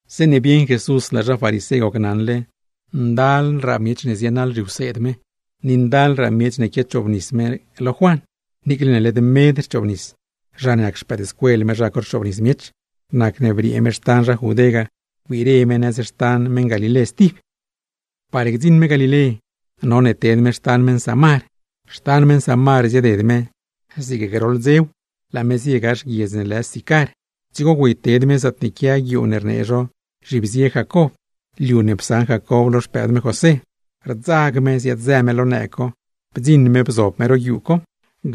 Zeeṉe bieṉ Jesús laa zha farisé gocnaṉle ndalraa miech zienaḻ zhiwseed me, ni ndalraa miech ne quiachoobnis me lo Juan (niicle ne led medpaa rchoobnis, sinque zha ne nac xpëëdscuel me zha co rchoobnis), nacne briee me xtan zha Judé ga, wbire me nëz xtan meṉ Galilé stib. Par gdziṉ me Galilé, none ted me xtan meṉ Samar. Xtan meṉ Samar zieded me, zig groḻ dzew, laa me zie gax guiedz ne lë Sicar, dzigo güeyted me zaatne quia guiuu ne rnee zho “Zhibzie Jacob”; lo liu ne psaṉ Jacob lo xpëëd me José padzeela. Rdzag me ziaad-zë me lo nëëg co, bdziṉ me bzob me ro guiuu co;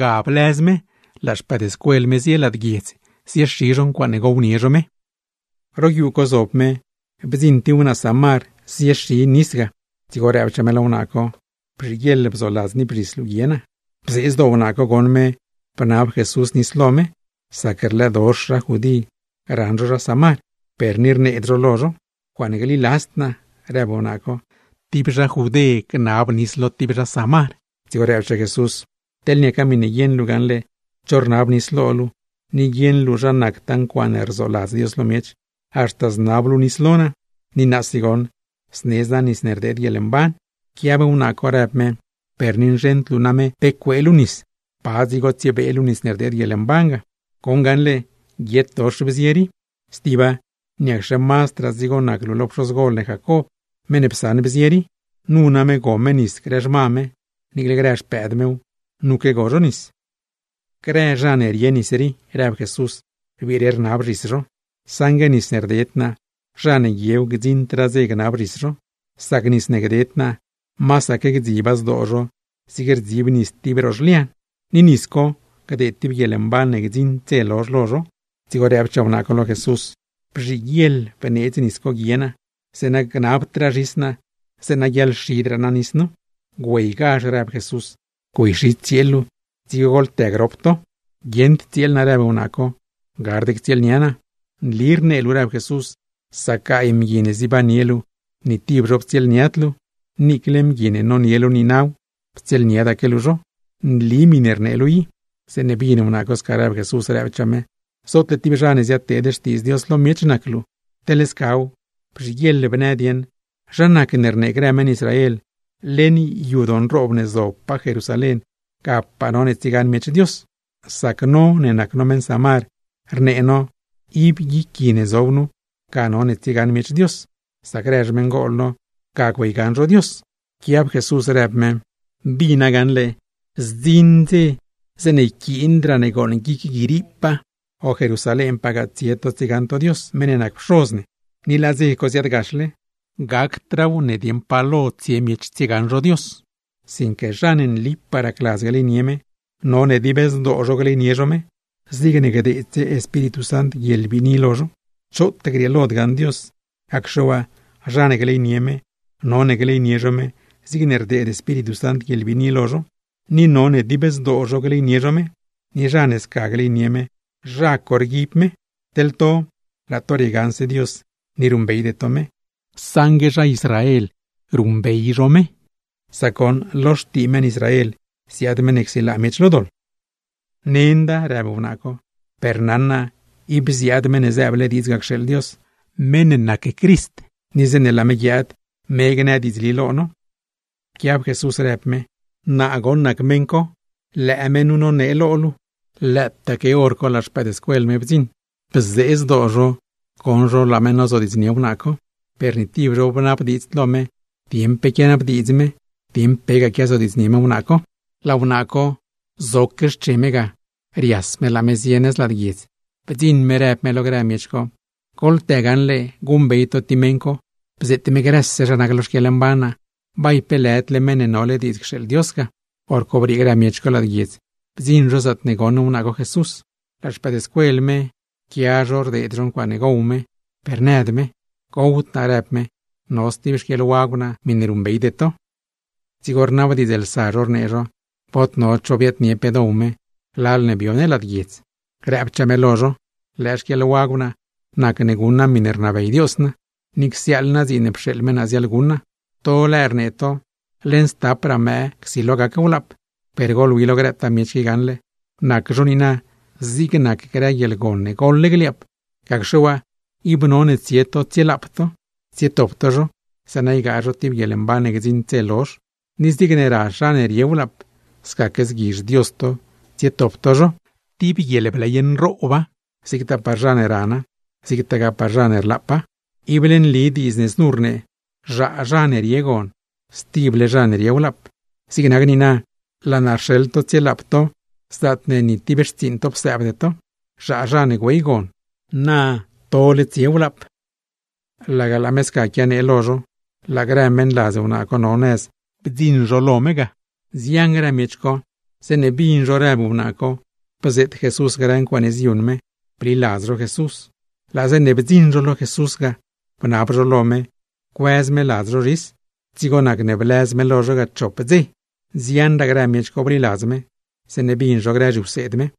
ga blëz me, laa no zio lad guiedz Sicar zioxi no ncuaaṉe dioownie no me. Ro guiuu co zob me bdziṉ tib wnaa Samar ziexi nis ga; dzigo rëbchaa me lo wnaa co: ―Bzhiguieḻ bzoladz niip zhis luu guie naa. Bzee zdoo wnaa co goṉ me bnab Jesús nis lo me, sac rlëëdox zha Judé raṉ zho zha Samar, per ni rneed zho lo zho. ―¡Ncuaaṉe gliladzd naa! ―rëb me―. ¡Ti zha Judé gnab nis lo ti zha Samar! Dzigo rëbchaa Jesús: ―Teḻ niaca miṉe guieṉ luu gaṉle cho rnab nis lo luu, ni guieṉ luu zha nactaa ncuaaṉe rzoladz Dios lo miech, haxta znab luu nis lo naa. Ni naasi goṉ, znedz naa nis ne rdeed guieḻmban. Pquiab wnaa co, rëb me: ―Per ni nzheṉd luu name pe cuee luu nis, ¿pa dzigo tsiebee luu nis ne rdeed guieḻmban ga? ¡Goṉ gaṉle, guietdox bzie rii! Stiba, ¿niacxe mazdraa dzigo nac luu que pxozgol ne Jacob, meṉ ne psaṉ bzie rii? Nu name go me nis grë xma me; niicle grë xpëëd mew, nuque go zho nis. ―Grëse zha ne rie nis rii ―rëb Jesús―, rbiire rnab zhis zho; saṉgue nis ne rded naa, zha ne guiew gdziṉdraa dze gnab zhis zho. Sac nis ne gded naa, masaque gdziba zdoo zho zig rdzib nis tib ro zhlian, ni nis co gdeed tib guieḻmban ne gdziṉ dze lozh lo zho. Dzigo rëbchaa wnaa co lo Jesús: ―Bzhiguieḻ bneedz nis co guie naa, zeeṉa gnabdraa zhis naa, zeeṉa guiaḻxidraa naa nis nu. ―Güeygazh ―rëb Jesús―, güeyxi tsieel luu, dzigo goḻtë grop to. ―Guieṉd tsieel naa ―rëb wnaa co―. Gard ctsieelnia naa. ―Nli rnee luu ―rëb Jesús―; sac gaay mgui ne zibannie luu, ni tib zho ptsieelniad luu, niicle mgui ne nonie luu niinaw, ptsieelniadaque luu zho. ¡Nli miṉe rnee luu i! Zeeṉe bin wnaa co sca rëb Jesús, rëbchaa me: ―Zootne tib zha ne ziadnee xtiidz Dios lo miech nac luu. Teḻ scaw, bzhiguieḻ bnë dieṉ, ¿zha nacne rnee grë meṉ Israel ne leṉ yadoo nroob ne zobpaa Jerusalén, gapaa none tsiegaṉ miech Dios? Sac no ne nac no meṉ Samar, rnee no ne ib guic gui ne zob nu, ga none tsiegaṉ miech Dios; sac grë xmeṉgol no ga güeygaṉ zho Dios. Pquiab Jesús rëb me: ―Bina gaṉle, zdziṉ dze zeeṉe yquiindraa ne gooṉ guic gui riipaa, o Jerusalénpagaa tsie to tsiegaṉ to Dios meṉ ne nac Pxoz ne. ¡Ni laa dze co ziaadgaxle! Gacdraaw ne dieṉ pa lo tsie ne tsiegaṉ ne Dios, sinque zha ne nlipaa racladz gleynie me, none dib zdoo zho gleynie zho me; zigne gdeedse Espíritu Sant guieḻbiini lo zho. ’Choot grieelod gaṉ Dios; gacxe waa zha ne gleynie me, none gleynie zho me zigne rdeed Espíritu Sant guieḻbiini lo zho; ni none dib zdoo zho gleynie zho me. Ni zha ne sca gleynie me, zha co rguib me. Teḻ to laa to riegaṉse Dios ni ruṉbeyde to me; saṉgue no rdziuuṉbey no meṉ ne riogaṉ no, sac goṉ lo xtii meṉ Israel ziaad meṉ ne guiaadsilaa miech lo doḻ. ―Nenda ―rëb wnaa co―, per naṉ naa ib ziaad Meṉ ne zëëble diidz ga cxeeḻ Dios, meṉ ne lë Crist; ni zeeṉe laa me guiaad, me gnë diidzli lo no. Pquiab Jesús, rëb me: ―¡Naa goṉ nac meṉ co! Lëë me nu nonee lo luu. Lëëtaaque hor co grëse no ne nac no xpëëdscuel me laa no bdziṉ. Bzee zdoo no bdzioṉ no laa me nozodiidznie wnaa co, per ni tib no bnabdiidzd lo me dieṉ pe quianabdiidz me, dieṉ pegaa quiazodiidznie me wnaa co. Laa wnaa co, zoque xche me ga, rias me laa me zie nëz lad guiedz. Bdziṉ me, rëb me lo grë miech co: ―¡Goḻtë gaṉle guṉbey to ti meṉ co! ¡Bzeet me grëse zha nac lo xquieḻmban naa! ¿Bay pe lëdle Meṉ ne nole diidz cxeeḻ Dios ga? Horco briee grë miech co lad guiedz, ziaad zho zaatne goṉ wnaa co Jesús. Laa no, quia no rdeed no ncuaaṉe gow me, per nëd me. ―Gowd naa ―rnee me―. No stib xquieḻwagw naa miṉe ruṉbeyde to. Dzigo rnabdiidzlsa no, rnee no: ―Bod no cho biaadnie pe dow me, lal ne bio ne lad guiedz. Nëchaa me lo no: ―Lëë xquieḻwagw naa nac ne guṉ naa miṉe rnabey Dios naa, ni csiaaḻ naa dziin ne pxeeḻ me naa ziaḻguṉ naa. To lëë rnee to: “Leṉ stapraa mëë csilo gac wlaap.” ¡Per goḻwi lo grëtaa miech qui gaṉle, nac zho niina zig grë guieḻgon ne goḻle gliaap! Gacxe waa, ib none tsie to tsielaap to, tsietop to zho, zeeṉa ygaa zho tib guieḻmban ne gdziṉd dze lozh. Ni zigne razh zha ne rie wlaap, scaque zguizh Dios to tsietop to zho. ¡Ti guieḻbley nrooba, zigtaa par zha ne rana, zigtagaa par zha ne rlaapa! Ible nli diidz ne znu rnee: “Zhaa zha ne rie gon, stible zha ne rie wlaap.” Zig nac niina, laa naa rxeḻ to tsielaap to zaatne ni tib xtsiiṉ to psëëbde to; zhaa zha ne güey gon, na tole tsie wlaap. Laga laa me sca quianee lo no, laa grë meṉladz wnaa co no nëz ziaad zho nëz lo no ga. Nzian grë miech co, zeeṉe bin zho rëb wnaa co bzeet Jesús grë ncuaaṉe ziyuṉ me, bliladz zho Jesús. Laa zeeṉe blanso zho ga, bnab zho lo me cuëz me ladz zho zhis. Dzigo nacne blëz me lo zho chop ngbidz. Nzianraa grë miech co bliladz me, zeeṉe bin zho grë zhiwseed me.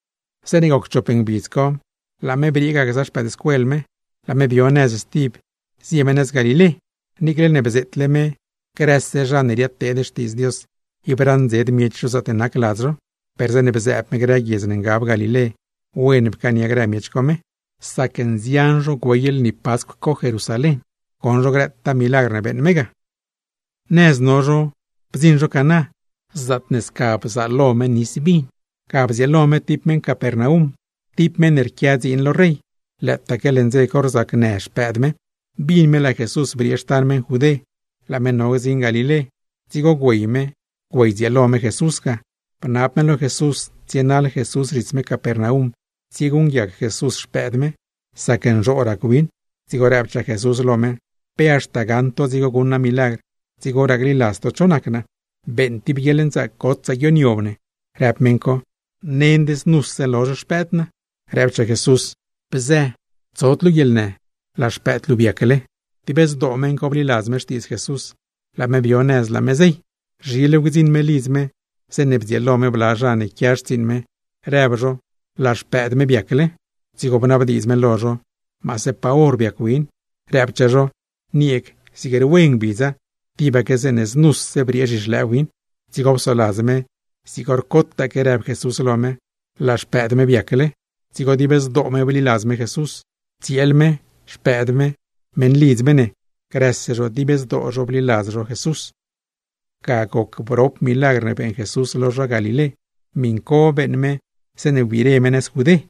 Zeeṉe goc chop ngbidz co, laa no briee ga gza no me, laa no bdzio nëz stib zio no nëz Galilé. Niicle ne bzeetle me: grëse zha ne ziadteed xtiidz Dios, ib raṉdzed miech zho zaatne nac ladz zho; per zeeṉe bzëëb me grë guiedz ne ngab Galilé, wen pcaania grë miech co me. Nzian zho güey lni Pascw co Jerusalén, goṉ zho grëtaa milagr ne beeṉ me ga. Nëz no no bdziṉ no Caná, zaatne sca bzaalo me nis vin. Ga bdzieelo me tib zha Capernaum, tib zha ne rquia dziin lo rey; lëëtaque leṉ dze co rzacnë xpëëd me. Bin me laa Jesús briee xtan meṉ Judé, laa me no gdziṉ Galilé. Dzigo biaad me biaddzieelo me Jesús ga, bnab me lo Jesús tsienaḻ Jesús zhits me Capernaum, tsieguṉguiac Jesús xpëëd me; sac nzhoo rac win. Dzigo rëbchaa Jesús lo me: ―¿Pe haxta gaṉ to dzigo guṉ naa milagr, dzigoraa gliladz to naa? ―Beeṉ tib guieḻnzaac gotsaa guioniob ne ―rëb meṉ co―, nend znuse lozh xpëëd naa. Rëbchaa Jesús: ―Bzë, tsod luu guieḻnë. ¡Laa xpëëd luu biacle! Dib zdoo meṉ co bliladz me xtiidz Jesús, laa me bio nëz laa me zey. Zhilew gdziṉ me lidz me, zeeṉe bdzieelo me bla zha ne quia xtsiiṉ me, rëb zho laa xpëëd me biacle. Dzigo bnabdiidz me lo zho, maase pa hor biac win. Rëbchaa zho: ―Nieeg, zig rwe ngbidza, tibaque znuse briee zhixlëë win. Dzigo psoladz me zig hor cotaque rëb Jesús lo me, laa xpëëd me biacle. Dzigo dib zdoo me bliladz me Jesús, tsieel me, xpëëd me, meṉlidz me ne, grëse zho dib zdoo zho bliladz zho Jesús. Ga goc brop milagr ne beeṉ Jesús lo zha Galilé. Miṉ co beeṉ me zeeṉe wbire me nëz Judé.